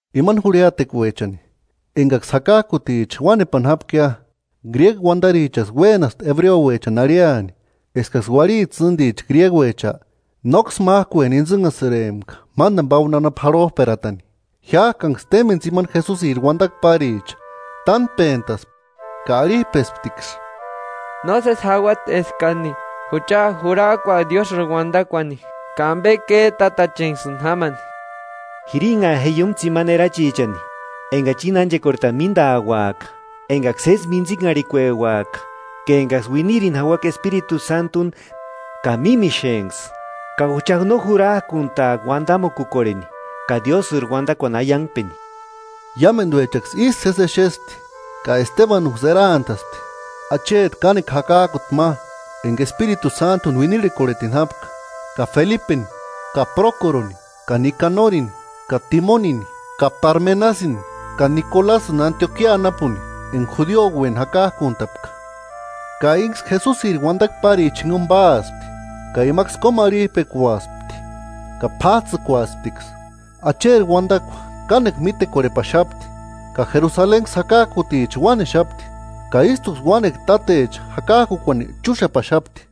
Imani jurhiatekuechani, enkaksï jakak'uticha uánepani jápkia, gríegu uantarichaksï uénaspti ebreuechani arhiani eskaksï uarhiti tsînticha gríeguecha, nóksï mák'ueni intsïnhasïrempka mántani pauani jarhop'eratani. Jiák'anksï témpeni tsimani Jesusiri uantakua páricha tánpentaspti ka arhip'esptiksï: –Nósesi jauati eskani jucha jurak'uaka Diósïri uantakuani, ka ampe két'atachenksïni jamani. Jiranhaa je iúmu tsimani erachi enkachi íni ánchekorhetani míntauaka enkaksï sési míntsinharhikueuaka ka enkaksï uinirini jauaka Espiritu Sántuni ka mímixenksï. Ka jucha no jurak'unt'aaka uantamukukorheni ka Diósïri uantakuani aiankpeni. Iámentuechaksï ísï sési exespti ka Estebanunksï eraantaspti, acheti kánekua jakak'uti ma enka Espiritu Sántuni uinirhekorhetini jápka, ka Felipeni ka Prókoroni ka Nikanorini ka Timonini ka Parmenasïni ka Nikolasïni Antiokia anapuni enka judioueni jakak'unt'apka. Ka ínksï Jesusiri uantakua párichani jinkuni páaspti, ka imaksï kómarhip'ekuaspti ka p'áts'ïkuasptiksï. Acheri uantakua kánekua mítekorhepaxapti, ka Jerusalenksï jakak'uticha uánexapti; ka ístuksï uánekua tátecha jakak'ukuani chúxapaxapti.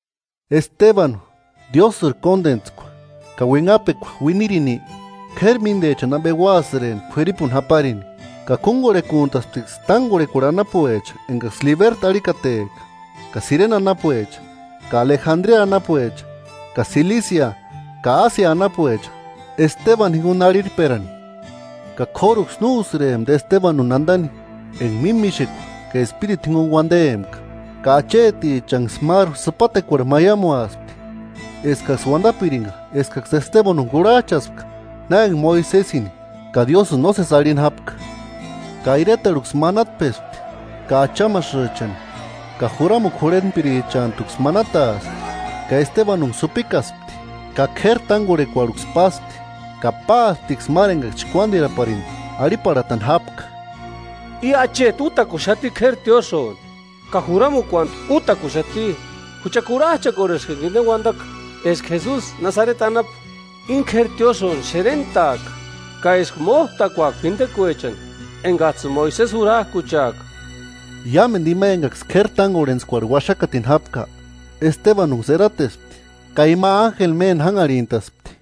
Estebanu, Diósïri kóntentskua ka uinhapekua uinirini, k'éri míntechani ampe úasïrempti k'uiripuni japarini. Ka kúnkorhekuntasptiksï tánkorhekuarhu anapuecha enkaksï “Libertu” arhikatepka, ka Sirene anapuecha, ka Alejandria anapuecha, ka Silisia ka Ásia anapuecha Estebanu jinkuni arhirperani. Ka k'óruksï no úsïrempti Estebanuni antani enka mímixekua ka Espiritu jinkuni uantempka. Ka achetichanksï máru sïpatekuarhu maiamuaspti eskaksï uantapirinka eskaksï Estebanuni kurhach'aspka na enka Moisesini ka Diósïni nósesi arhini jápka. Ka iretarhuksï manatpespti, ka achamasïchani ka juramukua jurhentpirichantuksï manataaspti, ka Estebanunksï jupikaspti ka k'éri tánkorhekuarhuksï páspti. Ka páasptiksï máru enkaksï chkuántiraparini arhiparhatani jápka: –I acheti útakuntaxati k'éri tiósïoni ka juramukuantu útakuxati. Jucha kurhach'akorheska enka inte uantaka, eska Jesusi Nasareti anapu íni k'éri tiósïoni xerent'aaka, ka eska mót'akuaka p'intekuechani enkats'ïni Moisesi jurak'ucheaka. Iámentu ima enkaksï k'éri tánkorhentskuarhu uaxakatini jápka, Estebanunksï eratespti ka ima ánjeli méni jánharhint'aspti.